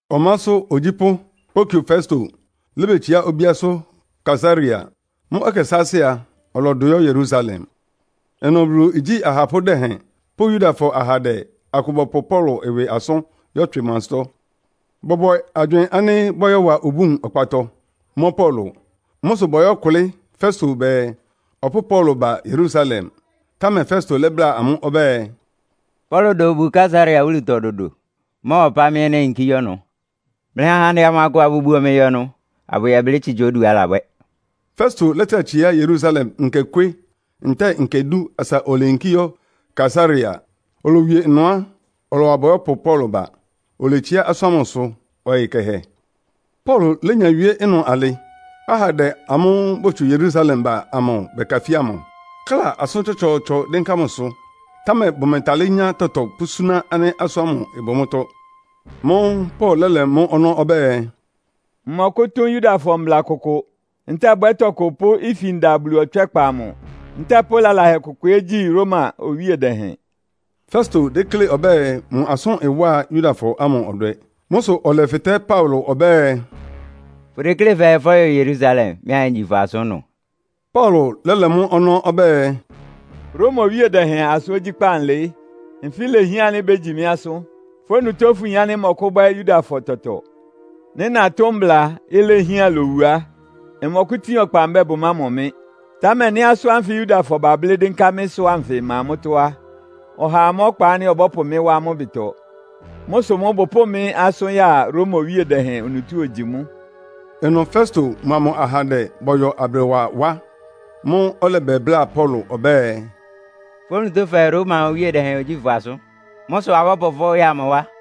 Ɔmásʋ́ ogyípʋ́ Porkio Festo lébetsiá obíásʋ́ Kaesarea. Mʋ́ ɛkɛ sáásɩ́ a, ɔlɔdʋ yɔ́ Yerusalem. Ɩnʋ Bulu igyí ahapʋ́ dɛhɛn pʋ́ Yudafɔ ahandɛ akʋ bɔpʋ Paulo ɩwɩ asʋ́n yɔ́tswɩ mʋ ansɩ́tɔ́. Bɔbwɛ agywɩɩn ánɩ́ bɔ́yɔwa obúun ɔkpatɔ, mɔ́ Paulo. Mʋ́ sʋ bɔyɔ́kʋlɩ́ Festo bɛɛ, ɔpʋ́ʋ Paulo ba Yerusalem. Támɛ Festo lɛ́bláa amʋ́ ɔbɛ́ɛ, “Paulo da obu Kaesarea wúlutɔ dodo. Ɩmɔ́ɔwa ɔpá mɩ́ ɛ́ néyinkí yɔ́ ɩnʋ. Mlɩha mlɩ ahandɛ amʋ akʋ abʋbuo mɩ yɔ ɩnʋ, abʋyɛblɩ́ tsitsa oduá alabwɛ́.” Festo lɛ́trá tsiá Yerusalem nkekwé ntɛ́ɛ nkɛ dú asa oleyinkí yɔ́ Kaesarea. Olowie ɩnʋ á, ɔlɔwa bɔyɔ́pʋ Paulo ba, oletsiá asʋ́n ámʋsʋ ɔyɩ kɛhɛ. Paulo lénya wíé ɩnʋ alɩ, ahandɛ amʋ́ʋ́ botsu Yerusalem ba amʋ bɛkafía mʋ, kla asʋ́n tsɔtsɔɔtsɔ dɩ́nká mʋsʋ. Támɛ bʋmɛtalɩ́ nyá tɔtɔ pʋ́súná ánɩ́ asʋ́n ámʋ ɩbʋ mʋ́tɔ́. Mʋ́ʋ́ Paulo lɛ́lɛ mʋ ɔnɔ́ ɔbɛ́ɛ, “Mmɔkʋ́tʋ́n Yudafɔ mbla kʋkʋ, ntɛ́ɛ bwɛ́ tɔkʋ pʋ́ ifin da Bulu ɔtswɛ́kpa amʋ ntɛ́ɛ pʋ́ lalahɛ kʋkʋ ɛ́ gyi Roma owíe dɛhɛn.” Festo déklé ɔbɛ́ɛ mʋ asʋ́n ɩwá Yudafɔ ámʋ ɔdwɛ. Mʋ́ sʋ ɔlɛfɩtɛ́ Paulo ɔbɛ́ɛ, “Fʋdeklé fɛɛ fɔ́yɔ Yerusalem, mɩ́ anyegyi fʋ́ asʋ́n ɩnʋ?” Paulo lɛ́lɛ mʋ́ ɔnɔ́ ɔbɛ́ɛ, “Roma Owíe Dɛhɛn asʋ́n ogyíkpá nlɩɩ́. Nfɩ́ ilehián ánɩ́ bégyi mɩ́ asʋ́n. Fʋ́ onutó fʋyin ánɩ́ mmɔkʋ́bwɛ́ Yudafɔ tɔtɔ. Nɩ́ natʋ́n mbla, ilehián lowu á, mmɔkʋ́tin ɔkpa mbɛ́ɛ bʋmámɔ mɩ́. Támɛ nɩ́ asʋ́n ánfɩ Yudafɔ bablɩ́ dɩ́nká mɩ́sʋ́ anfɩ ma mʋ́tɔ́ á, ɔhaa má ɔkpa ánɩ́ ɔbɔ́pʋ mɩ́ wá amʋ́ ɩbɩtɔ. Mʋ́ sʋ mʋ́ bʋpʋ́ʋ mɩ́ asʋ́n ya Roma Owíe Dɛhɛn onutó ogyi mʋ́.” Ɩnʋ Festo mʋa mʋ ahandɛ bɔyɔ abrɩwa wá. Mʋ́ʋ́ ɔlɛbɛbláa Paulo ɔbɛ́ɛ, “Fʋ́ onutó fɛɛ, Roma Owíe Dɛhɛn ogyíi fʋ́ asʋ́n. Mʋ́ sʋ abɔ́pʋ fʋ́ ya mʋ wá.”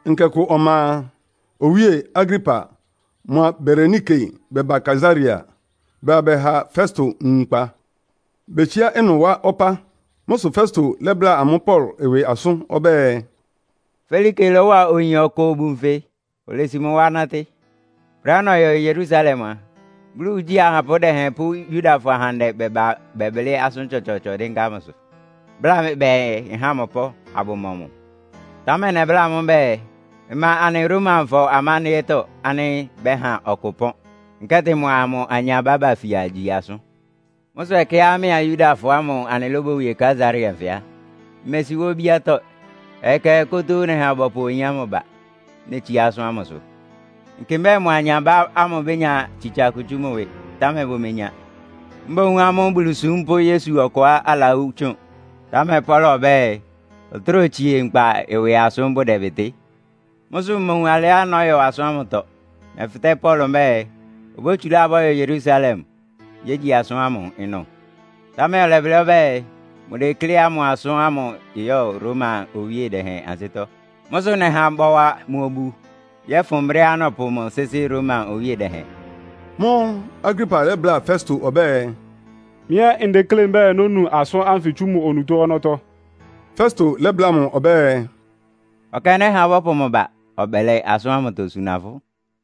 Nkɛ kʋ ɔma a, Owíe Agripa mʋa Berenike bɛba Kaesarea. Bɛbá bɛha Festo nwunkpa. Betsiá ɩnʋ wá ɔpá. Mʋ́ sʋ Festo lɛ́bláa amʋ́ Paulo ɩwɩ asʋ́n. Ɔbɛ́ɛ, “Felike lɔ́wa oyin ɔkʋ obu nfɩ, olesi mʋ wá nátɩ́. Brɛ́á nɔyɔ Yerusalem a, Bulu igyí ahapʋ́ dɛhɛn pʋ́ Yudafɔ ahandɛ bɛba bɛblɩ́ asʋ́n tsɔtsɔɔtsɔ dɩ́nká mʋsʋ, bláa mɩ bɛɛ nháa mʋ ɩpɔ́n, abʋmɔ mʋ. Támɛ nɛbláa amʋ́ mbɛ́ɛ, ‘Ɩma anɩ Romafɔ amándɩ́ɛ́tɔ́ ánɩ́ bɛ́ha ɔkʋ ɩpɔ́n, nkɛ́tɩ mʋa mʋ anyabá bafia gyi asʋ́n.’ Mʋ́ sʋ ɛkɛá mɩ́a Yudafɔ ámʋ anɩlóbowie Kaesarea nfɩ á, mmesi wá obíátɔ́. Ɔyɩ kɛhɛ kótóó nɛha bɔyɔ́pʋ oyin ámʋ ba, netsiá asʋ́n ámʋsʋ. Nkɩ mbɛ́ɛ mʋ anyabá ámʋ bénya tsitsa kʋ tsú mʋ ɩwɩ, támɛ bʋmenya. Mboún amʋ́ Bulusúm pʋ́ Yesu ɔkʋá alawú tsʋn, támɛ Paulo ɔbɛ́ɛ, ɔtráa otsie nkpa ɩwɩ asʋ́n bʋdɛbɩtɩ́. Mʋ́ sʋ mmowun alɩá nɔ́yɔ asʋ́n ámʋtɔ. Nɛfɩtɛ́ Paulo mbɛ́ɛ, obótsulá abʋyɔ Yerusalem, yégyi asʋ́n ámʋ ɩnʋ. Támɛ ɔlɛblɩ́ ɔbɛ́ɛ, mʋdekléá mʋ asʋ́n ɩyɔ́ Roma Owíe Dɛhɛn ansɩ́tɔ́. Mʋ́ sʋ nɛha bɔwa mʋ obu yɔ́fʋn brɛ́á nɔ́pʋ mʋ sɩ́sɩ́ Roma Owíe Dɛhɛn.” Mʋ́ʋ́ Agripa lɛ́bláa Festo ɔbɛ́ɛ, “Mɩ́ ɛ́ ndeklé mbɛ́ɛ nónu asʋ́n ánfɩ tsú mʋ onutó ɔnɔ́tɔ́.” Festo lɛ́bláa mʋ ɔbɛ́ɛ, “Ɔkɛ nɛ́ha bɔ́pʋ mʋ ba, ɔbɛlɛ asʋ́n ámʋtɔ suna fʋ́.”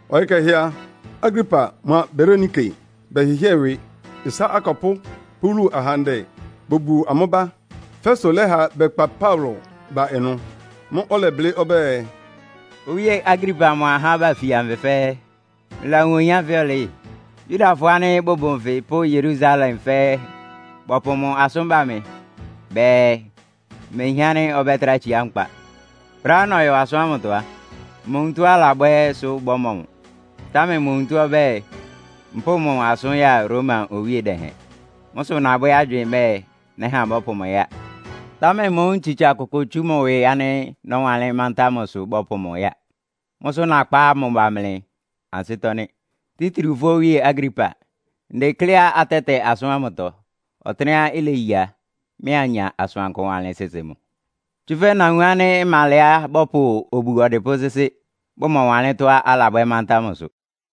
Ɔyɩ kɛhɛ a, Agripa mʋa Berenike bɛhɩ́hɩɛ ɩwɩ, ɩsá akɔpʋ́ pʋ́ wúlu ahandɛ bobuo amʋ́ ba. Festo lɛ́ha bɛkpa Paulo ba ɩnʋ. Mʋ́ʋ́ ɔlɛblɩ́ ɔbɛ́ɛ, “Owíe Agripa mʋa ahá ánɩ́ bafia nfɩ fɛ́ɛ́, mlɩlawun oyin ánfɩ ɔlɩɩ́? Yudafɔ ánɩ́ bʋbʋ nfɩ pʋ́ Yerusalem fɛ́ɛ́ bɔpʋ mʋ asʋ́n ba mɩ. Bɛɛ, mehián ánɩ́ ɔbɛ́trá tsiá nkpa. Brɛ́á nɔyɔ asʋ́n ámʋtɔ á, mmowun tɔ́á alabwɛ́ sʋ bɔ́mɔ mʋ. Támɛ mʋ onutó ɔbɛ́ɛ, mpʋ́ʋ mʋ asʋ́n ya Roma Owíe Dɛhɛn. Mʋ́ sʋ nabwɛ́ agywɩɩn mbɛ́ɛ, nɛ́ha bɔ́pʋ mʋ ya. Támɛ mmowun tsitsa kʋkʋ mʋ ɩwɩ ánɩ́ nɔ́wanlɩ́n mántá mʋsʋ bɔ́pʋ mʋ ya. Mʋ́ sʋ́ nakpá mʋ ba mlɩ ansɩ́tɔ́ nɩ́, títriu fʋ́ Owíe Agripa. Ndekléá atɛ́tɛ asʋ́n ámʋtɔ, ɔtɩ́nɛ́á ileyéyi a, mɩ́ anya asʋankʋ wanlɩ́n sɩ́sɩ́ mʋ. Tsúfɛ́ nawun ánɩ́ ɩma alɛá bɔ́pʋ obu ɔdɩpʋ́ sɩ́sɩ́, bʋmɔwanlɩ́n tɔ́á alabwɛ́ mántá mʋsʋ.”